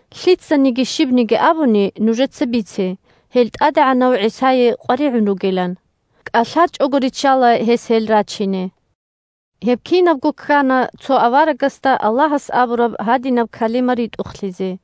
Лъицаниги щибниги абуни, нужеца бице, гьел ТӀадегӀанав ГӀисае къваригӀун ругилан. КӀалъачӀого риччала гьес гьел рачине. Гьеб кинабго ккана цо аварагасда Аллагьас абураб гьадинаб калима ритӀухълъизе: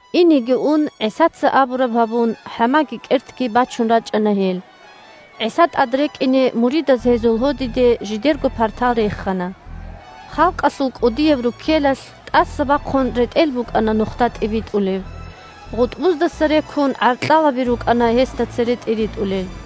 Инеги ун, ГӀисаца абураб гьабун, хӀамаги кӀертги бачун рачӀана гьел. ГӀиса тӀад рекӀине муридаз гьезул гьодиде жидерго партал рехана. Халкъалъул кӀудияб руккелалъ, тӀаса бахъун, ретӀел букӀана нухда тӀибитӀулеб. ГъутӀбуздаса рекун, гӀаркьалаби рукӀана гьесда цере тӀиритӀулел.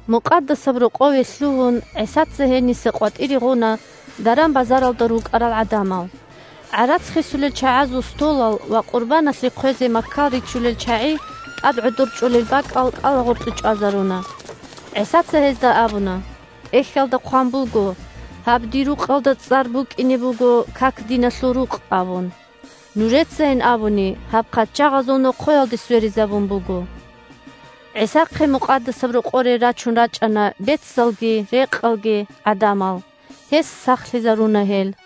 Мукъадасаб Рокъове лъугьун, ГӀисаца гьениса къватӀире гъуна даран-базаралда рукӀарал гӀадамал. ГӀарац хисулел чагӀазул столал ва къурбаналъе хъвезе маккал ричулел чагӀи тӀад гӀодор чӀолел бакӀал кӀалагъоркье чӀвазаруна. ГӀисаца гьезда абуна: – ТӀехьалда хъван буго: «Гьаб Дир рукъалда цӀар букӀине буго как-диналъул рукъ», – абун. Нужецайин абуни гьаб «хъачагъазул нохъоялде сверизабун буго». ГӀисахъе Мукъадасаб Рокъоре рачун рачӀана бецалги рекъалги гӀадамал. Гьес сахлъизаруна гьел.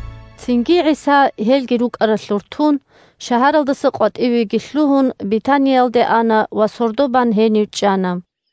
Цинги ГӀиса, гьелги рукӀаралъур тун, шагьаралдаса къватӀивеги лъугьун, Бетаниялде ана ва сордо бан гьенив чӀана.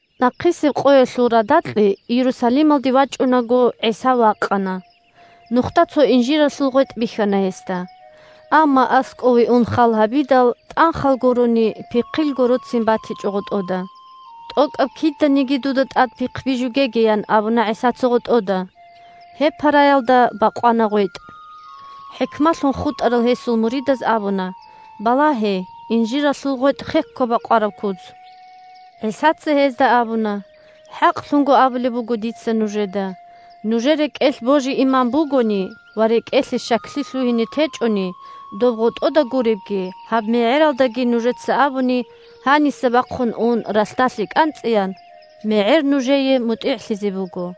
Нахъисеб къоялъул радакье Иерусалималде вачӀунаго, ГӀиса вакъана. Нухда цо инжиралъул гъветӀ бихьана гьесда. Амма аскӀове ун халгьабидал, тӀанхал гурони, пихъил гороцин батичӀо гъотӀода. – ТӀокӀаб киданиги дуда тӀад пихъ бижугеги, – ян абуна ГӀисаца гъотӀода. Гьеб параялда бакъвана гъветӀ. ХӀикмалъун хутӀарал гьесул муридаз абуна: – Балагье, инжиралъул гъветӀ хекко бакъвараб куц! ГӀисаца гьезда абуна: – ХӀакълъун абулеб буго дица нужеда: нужер рекӀелъ божи-иман бугони ва рекӀелъе щаклъи лъугьине течӀони, доб гъотӀода гуребги, гьаб мегӀералдаги нужеца абуни, гьаниса бахъун ун ралъдалъе кӀанцӀеян, мегӀер нужее мутӀигӀлъизе буго.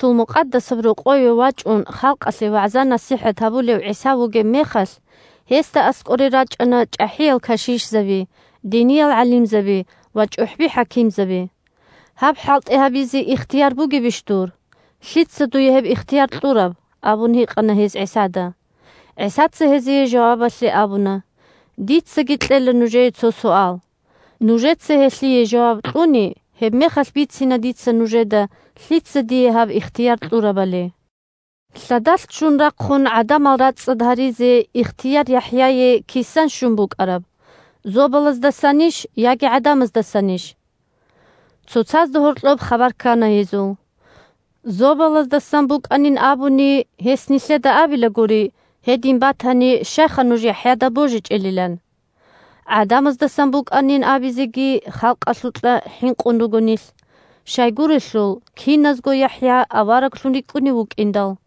Иерусалималъул Мукъадасаб Рокъове вачӀун халкъалъе вагӀза-насихӀат гьабулев ГӀиса вугеб мехалъ, гьесда аскӀоре рачӀана чӀахӀиял кашишзаби, диниял гӀалимзаби ва чӀухӀби-хӀакимзаби. – Гьаб хӀалтӀи гьабизе ихтияр бугебищ дур? Лъица дуе гьеб ихтияр кьураб? – абун гьикъана гьез ГӀисада. ГӀисаца гьезие жавабалъе абуна: – Дицаги кьела нужее цо суал. Нужеца гьелъие жаваб кьуни, гьебмехалъ бицина дица нужеда лъица дие гьаб ихтияр кьурабали. Лъадалъ ччун рахъун гӀадамал рацӀцӀад гьаризе ихтияр ЯхӀяе кисан щун букӀараб: зобалаздасанищ яги гӀадамаздасанищ? Цоцазда гьоркьоб хабар ккана гьезул. «Зобалаздасан букӀанин абуни, гьес нилъеда абилагури, гьедин батани, щайха нуж ЯхӀяда божичӀелилан. ГӀадамаздасан букӀанин абизеги халкъалъукьа хӀинкъун руго нилъ, щайгурелъул киназго ЯхӀя авараглъун рикӀкӀунев вукӀиндал».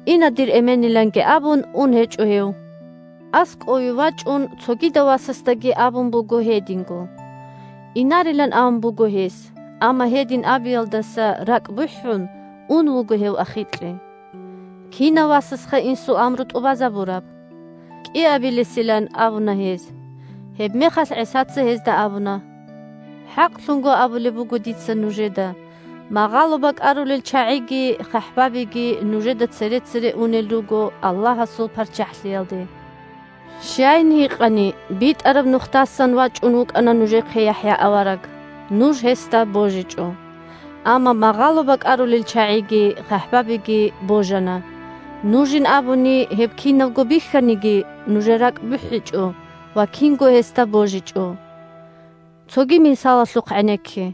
Ина, дир эмениланги, абун, ун гьечӀо гьев. АскӀове вачӀун, цогидав васасдаги абун буго гьединго. Инарилан абун буго гьес, амма гьедин абиялдаса ракӀ бухӀун, ун вуго гьев ахикье. Кинав васасха инсул амру тӀубазабураб? КӀиабилесилан абуна гьез. Гьебмехалъ ГӀисаца гьезда абуна: – ХӀакълъун абулеб буго дица нужеда: магъало бакӀарулел чагӀиги хъахӀбабиги нужеда цере-цере унел руго Аллагьасул ПарччахӀлъиялде. Щайин гьикъани: битӀараб нухдасан вачӀун вукӀана нужехъе ЯхӀя авараг. Нуж гьесда божичӀо. Амма магъало бакӀарулел чагӀиги хъахӀбабиги божана. Нужин абуни, – гьеб кинабго бихьаниги, нужер ракӀ бухӀичӀо ва кинго гьесда божичӀо. Цоги мисалалъухъ гӀенекке.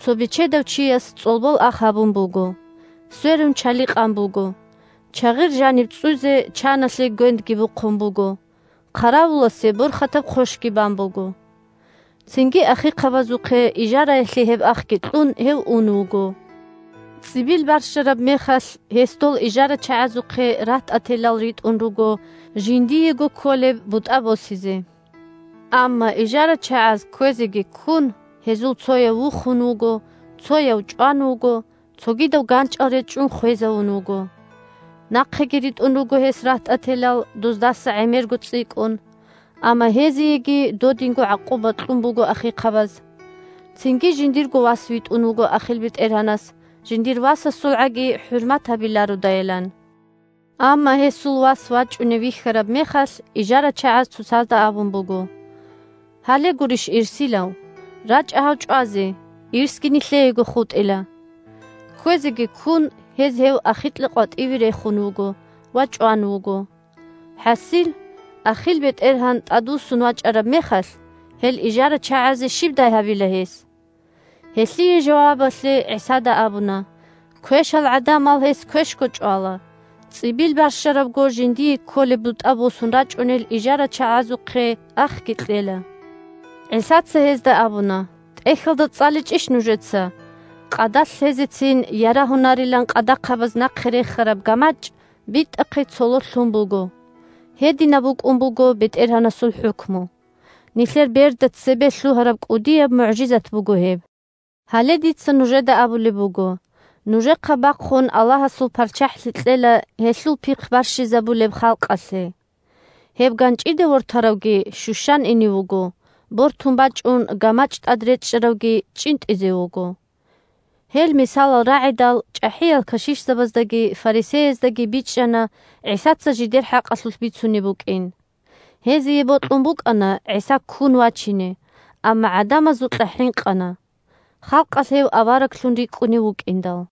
Цо бечедав чияс цӀолбол ах гьабун буго, сверун чали къан буго, чагъир жаниб цӀцӀуйзе чаналъе гвендги бухъун буго, хъаравуласе борхатаб хъощги бан буго. Цинги ахихъабазухъе ижараялъе гьеб ахги кьун, гьев ун вуго. ЦӀибил барщараб мехалъ, гьес дол ижарачагӀазухъе рагьтӀателал ритӀун руго жиндиего кколеб бутӀа босизе. Амма ижарачагӀаз, кквезеги ккун, гьезул цояв вухун вуго, цояв чӀван вуго, цогидав ганчӀал речӀчӀун хвезавун вуго. Нахъеги ритӀун руго гьес рагьтӀателал, доздаса гӀемерго цӀикӀкӀун. Амма гьезиеги додинго гӀакъуба кьун буго ахихъабаз. Цинги жиндирго вас витӀун вуго ахил бетӀергьанас, жиндир васасулгӀаги хӀурмат гьабилародайилан. Амма гьесул вас вачӀунев вихьараб мехалъ, ижарачагӀаз цоцазда абун буго: «Гьале гурищ ирсилав. РачӀа гьав чӀвазе, ирсги нилъеего хутӀила». Кквезеги ккун, гьез гьев ахикьа къватӀиве рехун вуго ва чӀван вуго. ХӀасил, ахил бетӀергьан тӀадвуссун вачӀараб мехалъ, гьел ижарачагӀазе щибдай гьабила гьес? Гьелъие жавабалъе ГӀисада абуна: – Квешал гӀадамал гьес квешго чӀвала. ЦӀибил барщарабго жиндие кколеб бутӀа босун рачӀунел ижарачагӀазухъе ахги кьела. ГӀисаца гьезда абуна: – ТӀехьалда цӀаличӀищ нужеца: «Къадалъ лъезецин ярагьунарилан къадахъабаз нахъе рехараб гамачӀ битӀахъе цололъ лъун буго. Гьединаб букӀун буго БетӀергьанасул хӀукму. Нилъер берда цебе лъугьараб кӀудияб мугӀжизат буго гьеб!» Гьале дица нужеда абулеб буго: нужехъа бахъун Аллагьасул ПарччахӀлъи кьела гьелъул пихъ барщизабулеб халкъалъе. Гьеб ганчӀиде вортаравги щущан ине вуго, бортун бачӀун гамачӀ тӀад речӀчӀаравги чӀинтӀизе вуго. Гьел мисалал рагӀидал, чӀахӀиял кашишзабаздаги фарисеяздаги бичӀчӀана ГӀисаца жидер хӀакъалъулъ бицунеб букӀин. Гьезие бокьун букӀана ГӀиса ккун вачине, амма гӀадамазукьа хӀинкъана. Халкъалъ гьев авараглъун рикӀкӀунев вукӀиндал.